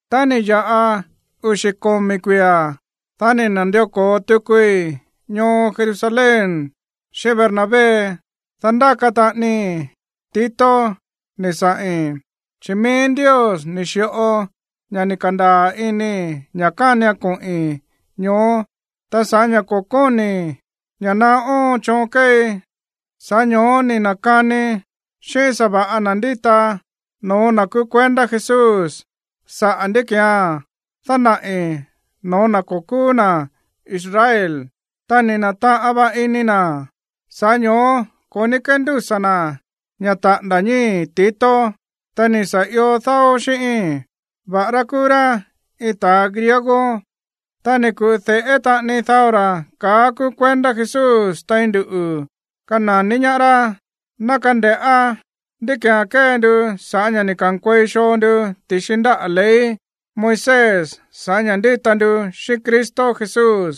Tá ni̱ ya̱ꞌa uxi̱ komi̱ kuia̱, dá ni̱ na̱ndió ko̱o tukui ñoo Jerusalén xíꞌín Bernabé. Ta ndáka taꞌanii Tito ni̱ saꞌi̱n. Chi̱ mií Ndios ni̱ xi̱ꞌo ña̱ ni̱ ka̱ndaa̱ inii̱ ña̱ kánian koꞌi̱n ñoó. Ta sa̱ꞌá ña̱ ko̱ kóni̱i̱ ña̱ naá óon choon kéei, sa̱ꞌá ño̱ó ni̱ na̱kanii xíꞌín sa̱va̱ꞌa na̱ ndíta no̱ó na̱ kúú kuendá Jesús saꞌa̱ ndí ki̱án dánaꞌi̱ no̱ó na̱ ko̱ kúú na̱ Israel. Ta ni̱ na̱taꞌan va ini na̱, sa̱ꞌá ño̱ó ko̱ ní kéndúsa̱ na̱ ña̱ taꞌa̱nda̱ ñíi̱ Tito, ta̱ ni̱ sa̱ ió dáó xíꞌíín, va̱ꞌará kúú rá iin ta̱a griego. Ta ni̱ ku̱ꞌu de̱ꞌé taꞌani dao ra̱ kaá kúú kuendá Jesús tein nduꞌu̱ kana̱ní ñaá rá, ná kande̱ꞌá ndí ki̱án kée ndu sa̱ꞌá ña̱ ni̱ ka̱nkuei xoo ndu ti̱xi ndáꞌa̱ ley Moisés sa̱ꞌá ña̱ ndíta ndu xíꞌín Cristo Jesús.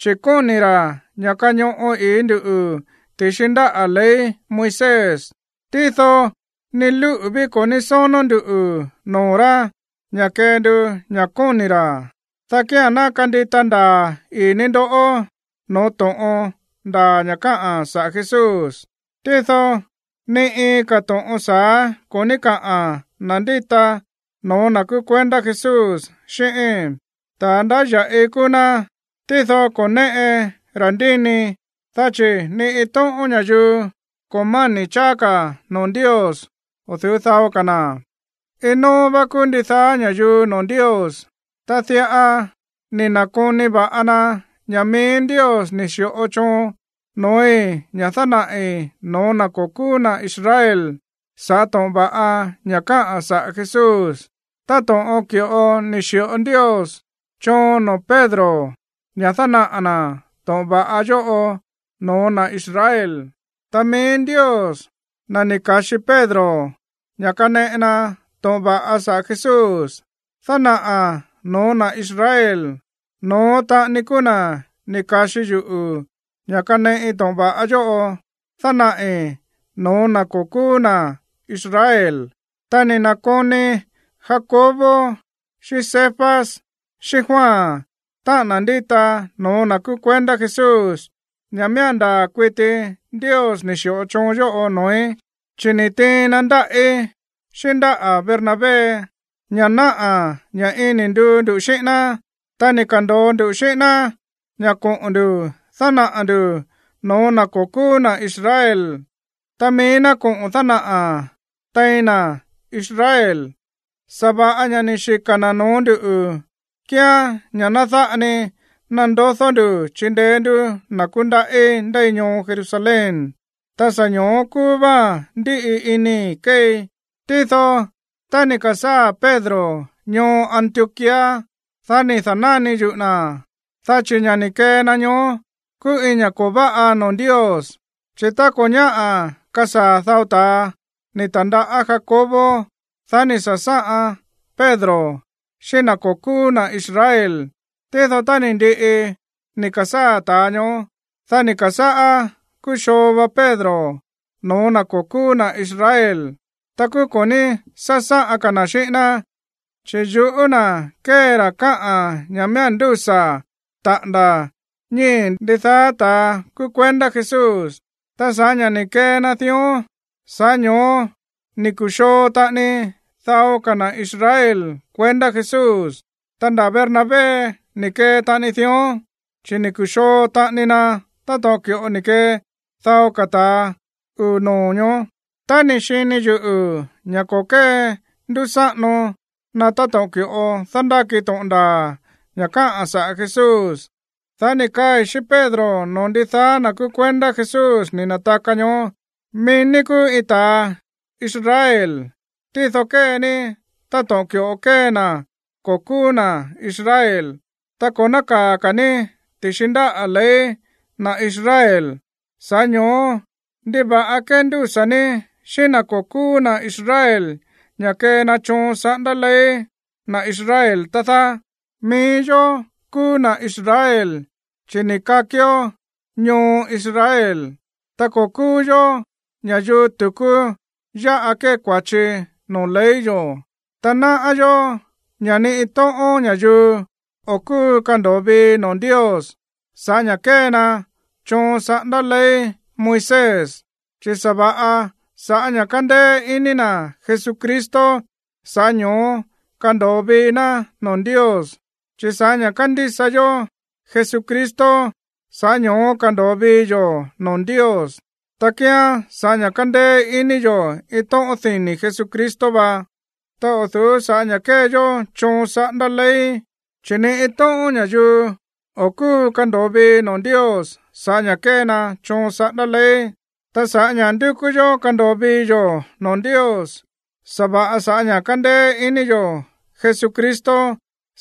Chi̱ kóni̱ ra̱ ña̱ kañoꞌo i̱í ndú ti̱xi ndáꞌa̱ ley Moisés. Tído ni lúꞌu̱ ví ko̱ ní sónó nduꞌu̱ noo̱ rá ña̱ kee ndu ña̱ kóni̱ ra̱, dá kía̱n ná kandita ndaa̱ ii̱ ní ndó no̱ó to̱ꞌon ndaa̱ ña̱ káꞌa̱n saꞌa̱ Jesús. Tído ni iin ka̱ to̱ꞌon sa̱á ko̱ ní kaꞌa̱n na̱ ndíta no̱ó na̱ kúú kuendá Jesús xíꞌíi̱n. Ta̱a ndáya̱ꞌi kúú ná, tído ko̱ néꞌe ta̱ndíni, dá chi̱ ni iin tóꞌón ña̱yuu ko̱ máni̱ cháá ka̱ noo̱ Ndios o̱ du̱ú dao ka̱ na̱. Iin nóó vá kúú ndidaá ña̱yuu noo̱ Ndios. Ta diꞌa ni̱ na̱koni va na ña̱ mií Ndios ni̱ xi̱ꞌo choon no̱ói̱ ña̱ dánaꞌi̱ no̱ó na̱ ko̱ kúú na̱ Israel sa̱ꞌá to̱ꞌon va̱ꞌa ña̱ káꞌa̱n saꞌa̱ Jesús, táto̱ꞌon ki̱ꞌo ni̱ xi̱ꞌo Ndios choon noo̱ Pedro ña̱ dánaꞌa̱ na̱ to̱ꞌon va̱ꞌa yóꞌo no̱ó na̱ Israel. Ta mií Ndios, na̱ ni̱ ka̱xi Pedro ña̱ kaneꞌe na to̱ꞌon va̱ꞌa saꞌa̱ Jesús dánaꞌa̱ no̱ó na̱ Israel, no̱ón taꞌani kúú na̱ ni̱ ka̱xi yuꞌu̱ ña̱ kaneꞌi to̱ꞌon va̱ꞌa yóꞌo dánaꞌi̱ no̱ó na̱ ko̱ kúú na̱ Israel. Ta ni̱ na̱koni Jacobo xíꞌín Cefas xíꞌín Juan, táꞌa̱n na̱ ndíta no̱ó na̱ kúú kuendá Jesús, ña̱ miía̱n ndaa̱ kuiti Ndios ni̱ xi̱ꞌo choon yóꞌo noo̱í, chi̱ ni̱ tiin na ndáꞌí, xíꞌín ndáꞌa̱ Bernabé, ña̱ náꞌa̱ ña̱ iin ni̱ nduu ndu xíꞌín ná. Ta ni̱ ka̱ndo̱o ndu xíꞌín ná ña̱ koꞌo̱n ndu̱ dánaꞌa̱ ndu̱ no̱ó na̱ ko̱ kúú na̱ Israel, ta mií ná koꞌo̱n dánaꞌa̱ tein na̱ Israel. Sa̱va̱ꞌa ña̱ ni̱ xika̱ na̱ no̱ó ndu̱ kíán ña̱ ná dáꞌa ni nandodó ndu̱ chindeé ndú na̱ kúndaꞌí ndéi ñoo Jerusalén. Ta sa̱ ño̱ó kúú váán ndíꞌi inii̱ keei. Tído tá ni̱ ka̱sáa̱ Pedro ñoo Antioquía, dá ni̱ da̱náni yuꞌu̱ na̱, dá chi̱ ña̱ ni̱ kee na ñoó kúú iin ña̱ ko̱ váꞌa noo̱ Ndios. Chi̱ tá ko̱ ñáꞌa̱ kasaa̱ dao ta̱a ni̱ ta̱ndaꞌá Jacobo, dá ni̱ sa̱sáꞌan Pedro xíꞌín na̱ ko̱ kúú na̱ Israel. Tído tá ni̱ ndiꞌi ni̱ ka̱sáa̱ ta̱a ñoó, dá ni̱ ka̱sáꞌá kúxoo va Pedro no̱ó na̱ ko̱ kúú na̱ Israel. Ta kúú ko̱ ní sásáꞌan ka̱ na̱ xíꞌín ná, chi̱ yuꞌú na̱ kée ra̱ káꞌa̱n ña̱ miía̱n ndúsa̱ taꞌa̱nda̱ ñíi̱ ndidaá ta̱a kúú kuendá Jesús. Ta sa̱ꞌá ña̱ ni̱ kee na dión, sa̱ꞌá ño̱ó ni̱ ku̱xoo taꞌani dao ka̱ na̱ Israel kuendá Jesús. Ta nda̱ Bernabé ni̱ kee taꞌani dión, chi̱ ni̱ ku̱xoo taꞌani na táto̱ꞌon ki̱ꞌo ni̱ kee dao ka̱ ta̱ uu̱ noo̱ ñoó. Tá ni̱ xini yuꞌu̱ ña̱ ko̱ kéndúsáꞌano na táto̱ꞌon ki̱ꞌo dándáki to̱ꞌon ndaa̱ ña̱ káꞌa̱n saꞌa̱ Jesús, dá ni̱ kaai̱ xíꞌín Pedro noo̱ ndidaá na̱ kúú kuendá Jesús ni̱ na̱taka ñoó: “Mií ní kúú iin ta̱a Israel, tído kée ní táto̱ꞌon ki̱ꞌo kée na̱ ko̱ kúú na̱ Israel, ta ko̱ nákaa̱ ka̱ ní ti̱xi ndáꞌa̱ ley na̱ Israel. Sa̱ꞌá ño̱ó, ¿ndiva̱ꞌa kéndúsa̱ ní xíꞌín na̱ ko̱ kúú na̱ Israel ña̱ kee na choon saꞌándá ley na̱ Israel, tá dáá? “Mií yó kúú na̱ Israel, chi̱ ni̱ kakió ñoo Israel. Ta ko̱ kúú yó ña̱yuu tu̱kú yáꞌa kée kua̱chi noo̱ ley yo̱. Ta náꞌá yó ña̱ ni iin tóꞌón ña̱yuu o̱ kúu kando̱o vii noo̱ Ndios sa̱ꞌá ña̱ kée na choon saꞌándá ley Moisés, chi̱ sa̱va̱ꞌa sa̱ꞌá ña̱ kándéé iní na̱ Jesucristo, sa̱ꞌá ño̱ó kándo̱o vii ná noo̱ Ndios. Chi̱ sa̱ꞌá ña̱ kándísa yó Jesucristo, sa̱ꞌá ño̱ó kándo̱o vii yo̱ noo̱ Ndios. Ta kíán sa̱ꞌá ña̱ kándéé iní yo̱ iin tóꞌón dini̱ Jesucristo va, ta o̱ du̱ú sa̱ꞌá ña̱ kée yó choon saꞌándá ley. Chi̱ ni iin tóꞌón ña̱yuu o̱ kúu kando̱o vii noo̱ Ndios sa̱ꞌá ña̱ kée na choon saꞌándá ley. “Ta sa̱ꞌá ña̱ ndúkú yó kando̱o vii yo̱ noo̱ Ndios sa̱va̱ꞌa sa̱ꞌá ña̱ kándéé iní yo̱ Jesucristo,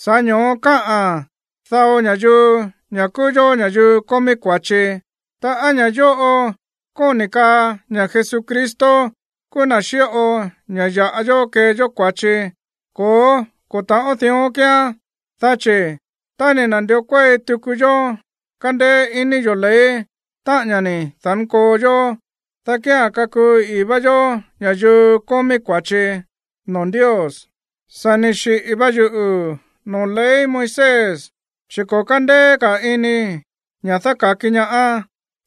sa̱ꞌá ño̱ó káꞌa̱n dao ña̱yuu ña̱ kúú yó ña̱yuu kómí kua̱chi. Ta, ¿á ña̱ yóꞌo kóni̱ kaa ña̱ Jesucristo kúú na̱ xíꞌo ña̱ ya̱ꞌa yó kee yó kua̱chi? Ko̱ó, ko̱ ta̱ꞌón dión kíán. Dá chi̱ tá ni̱ na̱ndió kuéi tuku yó kándéé iní yo̱ ley, táꞌa̱n ña̱ ni̱ da̱nkoo yó, dá kía̱n kakuu ii̱ vá yó ña̱yuu kómí kua̱chi noo̱ Ndios. “Sa̱ ni̱ xiꞌi̱ va yuꞌu̱ noo̱ ley Moisés, chi̱ ko̱ kándéé ka̱ iníi̱ ña̱ dáka̱ki ñaá.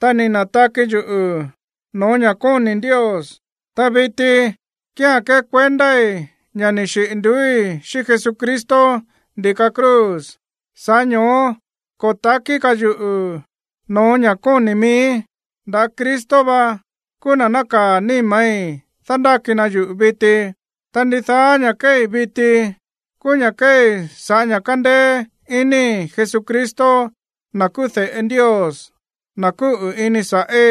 Ta ni̱ na̱taki yuꞌu̱ no̱ó ña̱ kóni̱ Ndios. Ta viti kíán kékuendái̱ ña̱ ni̱ xiꞌi̱ nduúi̱ xíꞌín Jesucristo ndi̱ka cruz. Sa̱ꞌá ño̱ó ko̱ ta̱kí ka̱ yuꞌu̱ no̱ó ña̱ kóni̱ miíí. Nda̱ Cristo va kúú na̱ nákaa̱ níma̱í dándáki na yuꞌu̱ viti. Ta ndidaá ña̱ kéei viti, kúú ña̱ kéei sa̱ꞌá ña̱ kándéé iníi̱ Jesucristo, na̱ kúú de̱ꞌe Ndios, na̱ kúꞌu̱ ini sa̱ꞌí,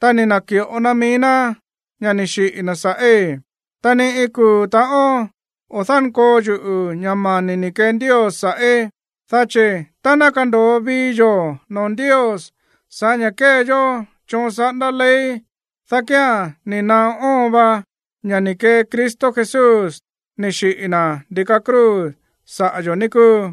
ta ni̱ na̱ki̱ꞌo na mií ná ña̱ ni̱ xiꞌi̱ na̱ sa̱ꞌí. Ta ni iin kuu̱ ta̱ꞌón o̱ dánkoo yuꞌu̱ ña̱ mani̱ ni̱ kee Ndios sa̱ꞌí. Dá chi̱ tá ná kando̱o vii yo̱ noo̱ Ndios sa̱ꞌá ña̱ kée yó choon saꞌándá ley, dá kía̱n ni̱ naá óon va ña̱ ni̱ kee Cristo Jesús ni̱ xiꞌi̱ na̱ ndi̱ka cruz saꞌa̱ yo̱, ní kúu.”